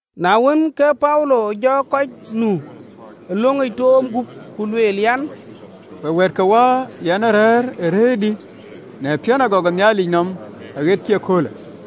Na wën, ke Paulo jɔ kɔc nu ë löŋic toom gup, ku lueel an, “Week, wɛ̈ɛ̈tkewäär, yɛn ee rëër ë rëërdï në piɔ̈n agɔk ë Nhialic nɔm aɣet cï ëköölë.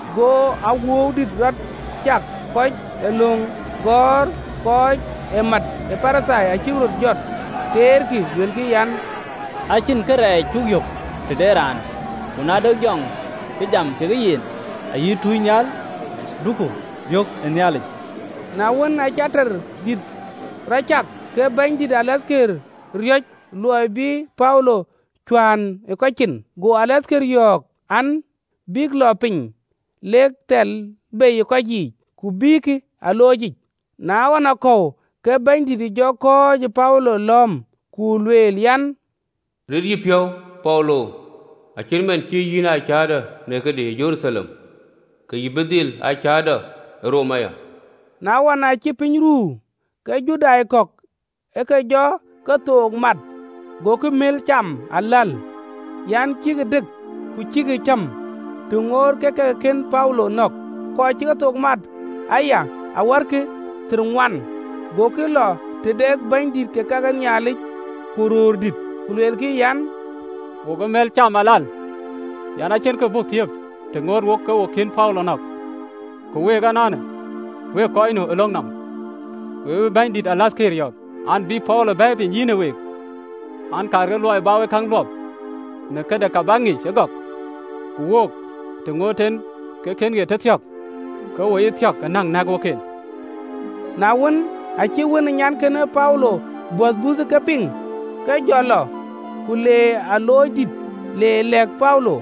Go awuɔɔu dït rɔt cak, kɔc ee löŋ gɔ̈ɔ̈r kɔc ë mat ë Parithai acïk röt jɔt, teerkï, luelkï an, “Acïn kërɛɛc cuk yök tëde raanë, ku na de jɔŋ cï jam kekë yen, ayï tunynhial, duku biɔ̈k ë Nhialic!” Na wën, aacï teer dït rɔt cak, ke bɛ̈nydïït de rem de tɔŋ ë riɔ̈c luɔi bï Paulo cuään ë kɔc cin, go rem de tɔŋ yɔ̈ɔ̈k an, bïk lɔ piny, lek thɛ̈l bei ë kɔc yiic, ku bïïkï ë aloocic. Na ɣɔnakɔ̈u, ke Bɛ̈nydït jɔ kɔ̈ɔ̈c ë Paulo lɔ̈ɔ̈m, ku lueel an, “Rit yïpiɔ̈u, Paulo, acït man cï yïn aa cäätɔ në këdï ë Jeruthalem, ke yïn bï dhil aa cäätɔ ë Roma aya.” Na wën, aacï piny ruu, ke Judai kɔ̈k ë ke jɔ kethook mat, gokï gutguut looi aläl an, cïkï dëk ku cïkï cäm, të ŋoot kek ke ke kën Paulo nɔ̈k. Kɔc cï kethook mat aya awärkï thiërŋuan. Gokï lɔ tëde bänydït ke ka ke Nhialic ku röördït, ku luelkï an, “Wok cï gutguut looi aläl, an, acïn kë buk thiëëp të ŋoot wok ke wo kën Paulo nɔ̈k. Ku week ënɔɔnë, wekë kɔc nu ë löŋ nɔm we bï bɛ̈nydïït de rem de tɔŋ yɔ̈ɔ̈k an, bï Paulo bɛ̈ɛ̈i piny yïnë week an, kaarkï luɔi bä wek käŋ luɔp në këde, ka bäk ŋic ëgɔk, ku wook, të ŋoot en ke kën ɣet tëthiɔ̈k, ke wo ye thiɔ̈k ë näŋ nɛ̈k wok en.” Na wën, aacï wën ë nyankënë Paulo böth buuthë ke piŋ, ke jɔ lɔ, ku le ë aloocdïtic le lɛ̈k Paulo.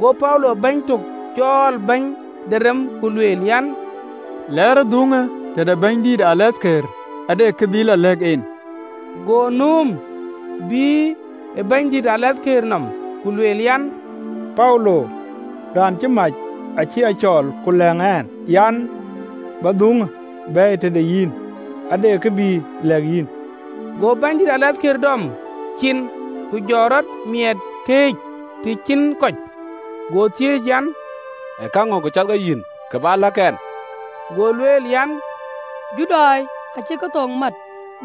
Go Paulo bɛ̈ny tök cɔɔl, bɛ̈ny de rem, ku lueel an, “Lɛɛrë dhuŋë tëde bɛ̈nydïït de rem de tɔŋ, ade kë bï lɔ lɛ̈k en.” Go nööm, bïï ë bɛ̈nydïït de rem ë tɔŋ nɔm, ku lueel an, “Paulo, raan cï mac, acï a cɔɔl, ku lɛ̈ŋ ɛn an, bä dhuŋë bɛ̈ɛ̈i tëde yïn, ade kë bï lëk yïn.” Go bɛ̈nydïït de rem de tɔŋ dɔm cin, ku jɔkï röt miɛɛt këëc, të cïn kɔc, go thiëëc an, “Ee käŋö kë cath ke yïn kë bä lɛ̈k ɛn?” Go lueel an, “Judai acïk kethook mat,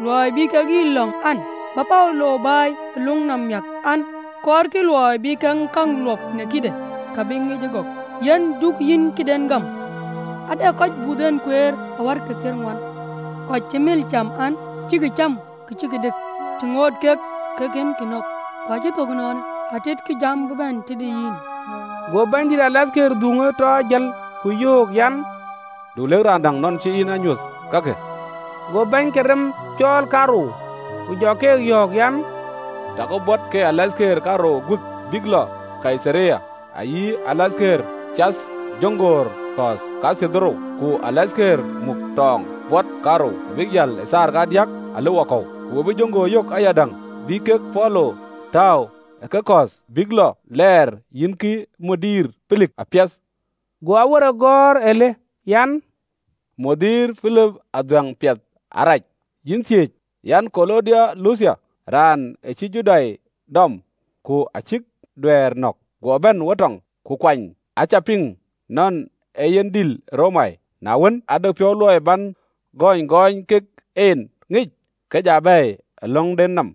luɔi bï kek yï lɔ̈ŋ an, bä Paulo bɛ̈ɛ̈i ë löŋ nɔm miäk an, kɔɔrkï luɔi bï kek käŋ luɔp në këde, ka bïk ŋic ëgɔk. Yen du yïn këden gam, ade kɔc buth en kueer, awärkï thiërŋuan, kɔc cï gutguut lueel an, cïkï cäm ku cïkï dëk të ŋoot kek ke kënkï nɔ̈k, ku acïk thök ënɔɔnë, atitkï jam bï bɛ̈n tëde yïn.” Go bɛ̈nydïït de rem de tɔŋ dhuŋë tɔ jël, ku yöök an, “Du lëk raan däŋ nɔn cï yïn a nyuöth kakë.” Go bäny ke rem cɔɔl kaarou, ku jɔ ke yɔ̈ɔ̈k an, “Takï bot ke rem de tɔŋ kaarou guik bïk lɔ Kaitharia, ayï rem de tɔŋ cath ë jöŋgöör kɔ̈ɔ̈th kathiërdhorou, ku rem de tɔŋ muk tɔɔŋ bot kaarou, abïk jäl ë thaar kadiäk ëlë wakɔ̈u. Ku we bï jöŋgöör yök ayadäŋ, bï kek Paulo tääu ë kekɔ̈ɔ̈th, bïk lɔ lɛɛr yïnkï bɛ̈ny Pelik apiɛth. Go awerek gɔ̈ɔ̈r alë: an, “Bɛ̈ny Pelik adhuɛ̈ŋ piɛth arac, yïn thiëëc, yan Kulaudio Luthia. Raanë acïï Judai dɔm, ku acïk duɛ̈ɛ̈r nɔ̈k, guɔ bɛ̈n wo tɔŋ, ku kuɔny. Acä piŋ nɔn ee yen dïl ë Romai. Na wën, aa dɛ piɔ̈u luɔi bän gööny gɔɔny kek en ŋic, ke ja bɛ̈ɛ̈i ë löŋden nɔm.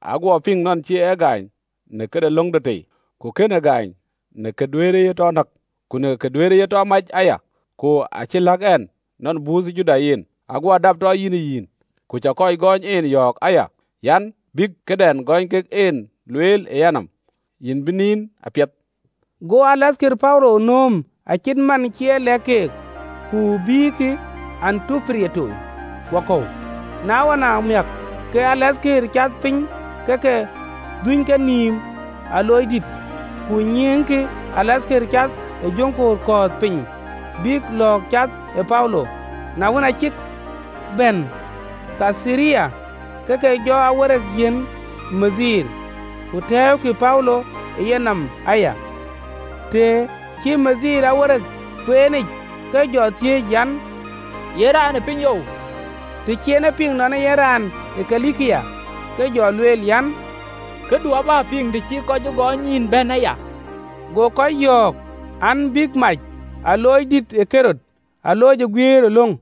Aguɔ piŋ nɔn cï e gaany në këde löŋden tei, ku kënë gaany në kë duëërë ye tɔ näk, ku kë duëërë ye tɔ mac aya. Ku acï lɛ̈k ɛn nɔn buuthë Judai yen, aguɔ dap tɔ yïnë yïn, ku cä kɔc gɔɔny en yɔ̈ɔ̈k aya an, bïk këdɛn ë gɔɔny kek en lueel ë yïnɔm. Yïn bï nin apiɛth.” Go rem de tɔŋ Paulo nööm, acït man cï e lɛ̈k keek, ku bïïkï Antipatiri wakɔ̈u. Na ɣɔn amiäk, ke rem de tɔŋ ë cath Paulo ke ke dhuny kenïïm aloocdït, ku nyiëëŋkï rem de tɔŋ cath ë jöŋgöör kɔ̈ɔ̈th piny, bïk lɔ̈ɔ̈k cath ë Paulo. Na wën, aa cïk bɛ̈n Kaitharia, ke ke jɔ awerek yiɛ̈n bɛ̈ny, ku tɛ̈ɛ̈ukï Paulo ë yenɔm aya. Të cï bɛ̈ny këcïgɔ̈ɔ̈r kueenic, ke jɔ thiëëc an, ye raan ë pinyou? Të cï en e piŋ nɔn ee yen raan ë Kilikia, ke jɔ lueel an, “Këdu abä piŋ, të cï kɔc gɔɔny yïn bɛ̈n aya.” Go kɔc yɔ̈ɔ̈k an, bïk mac aloocdïït ë Ɣerod yic, alooc ë guiëër ë löŋ.